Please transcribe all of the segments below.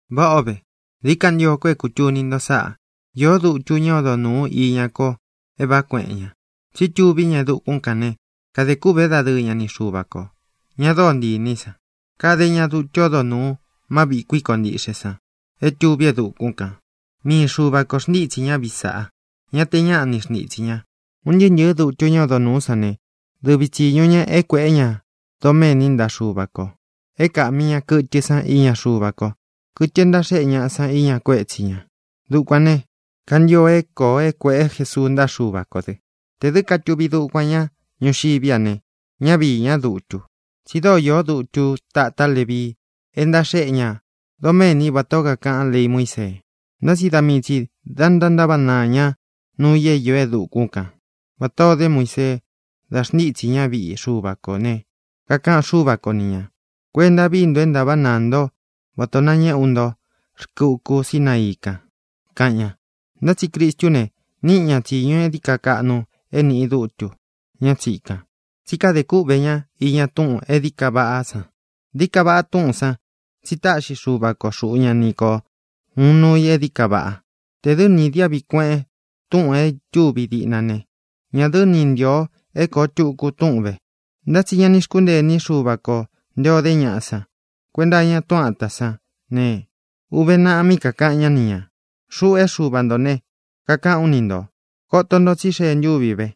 Váꞌa ō ve. Dií ka ntio ko é kūtuni nto sáꞌā: Īó dutu ñá odo nūu iña ko é vāꞌá kueꞌen ña, tsi tuví ña e dukún kān ne, kadē kûꞌvé dadɨɨ ña ni Xuva kō, ña dóo ntii inī í san. Kade ña dutu ódo nūu má viꞌī kuikó ntiꞌxe san é tuví e dukún kān. Mii Xuva kō xntítsī ñá viꞌi sāꞌá; ña te ñáꞌa ni xntitsī ña. Un ntɨɨ́ ntɨ̄ɨ́ dutu ñá odo nūú san ne, dɨvi tsīñu ña é kuēꞌé ña doméni ntaꞌa Xuva kō, é kāꞌmi ña kɨtɨ san iña Xuva ko, kɨtɨ e ntaxéꞌe ñaꞌa san iña kuétsi ñā. Dukuān ne, kantio é kōo é kuēꞌé Jesuu ntaꞌa Xúva kō dɨ. Tē dɨ́ katuvi dukuan ña ñuxiví a ne, ñá viī ñá dutu, tsi dóo īó dutu táta Levii e ntaxéꞌe ña doméni vatā ó kakaꞌán lei Muísee. Ntá tsi da mii tsī da ntántaváꞌa naa ña nuu i é īó e dukún kan, vatā o dé Muisee da xntítsī ñá viꞌi Xuva kō ne, kakaꞌan Xúva ko ni ñā: “Kuenta vií nto é ntāváꞌa naa nto vatā o nañéꞌe ú nto rkɨ uku Sínaií kān”, kaꞌan ña. Ntá tsi Cristú ne, níꞌi ña tsīñu e dií ka kaꞌnu é nīꞌi dútu, ñá tsīkan, tsí kade kúꞌvē ñá iña túꞌūn e dií ka vaꞌá san. Dií ka vaꞌa túꞌūn san tsi táꞌxi Xuva ko xuꞌu ña ni ko uun nuu i e dií ka vaꞌa. Tē dɨ́ ni īdiáꞌvi kueꞌen túꞌūn é ītúvi diꞌna ne, ñā dɨ́ ni ntīo é kōo tuku túꞌun vē. Ntá tsi ña ni xkúntee iní Xuva kō nté ō dé ñaꞌa san kuenta iña túꞌun āta sán ne, uve naꞌa mí kakāꞌan ñá ni ñā: Xuꞌu é Xuva ntō ne, kakaꞌán u ni ntō: Koto nto tsí xee ntúvi ve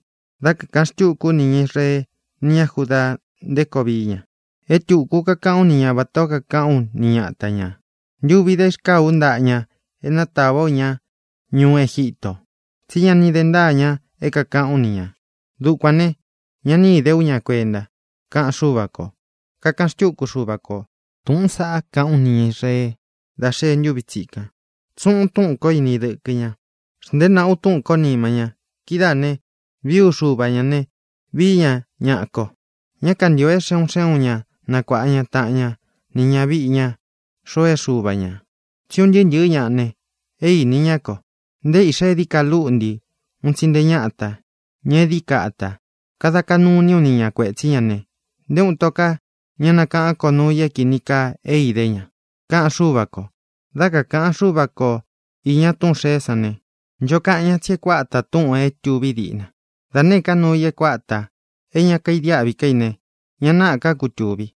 dá kāꞌan xtúku ú nī ña Israeé nī ña Judaa nté koo vií ña. É tūku kakaꞌán u ni ña vatā ó kakaꞌán u ni ñata ña ntūvi dá irkáa ú ntaꞌa ña e nátāvá u ña ñuú Egítō; tsi ñá ni de ntāa ña é kākaꞌán u ni ñā. Dukuān ne, ña ni íde ú ña kuenta, kaꞌan Xúva kō. Kakaꞌan xtúku Xuva kō: Túꞌūn saꞌá kaꞌán u nī ña Israee dá xee ntúvi tsīkan. Tsuꞌun u túꞌūn ko ini dɨkɨ ña. Xnteé naꞌá u túꞌūn kó nima ña. Kidáā ne, vií u Xuva ñā ne, vií ña ñaꞌa ko. Ñá kantīo é xe un xé un ña nakuāꞌa ña taꞌan ña ni ñaviꞌi ña xoo e Xuva ña, tsí un ntɨɨ́ ntɨɨ̄ ñá ne, é īni ñá ko, nté īꞌxá e dií ka lúꞌntī un tsi nté ñatā, ña e dií ka atā. Kada kaꞌnu iní u ni ña kuētsí ña ne, nté uun ito ká ña nakáꞌān ko nuu i é kīni kaa é idé ña, kaꞌan Xúva kō. Dá kakāꞌan Xúva ko īña túꞌūn xeé san ne, ncho kaꞌan ñá tsi e kuáta tūꞌun é tuví diꞌna. Da nēé ka nuu i é kuatā, é ña kaidiáꞌvi ká i ne, ña náꞌā ká kutūvi.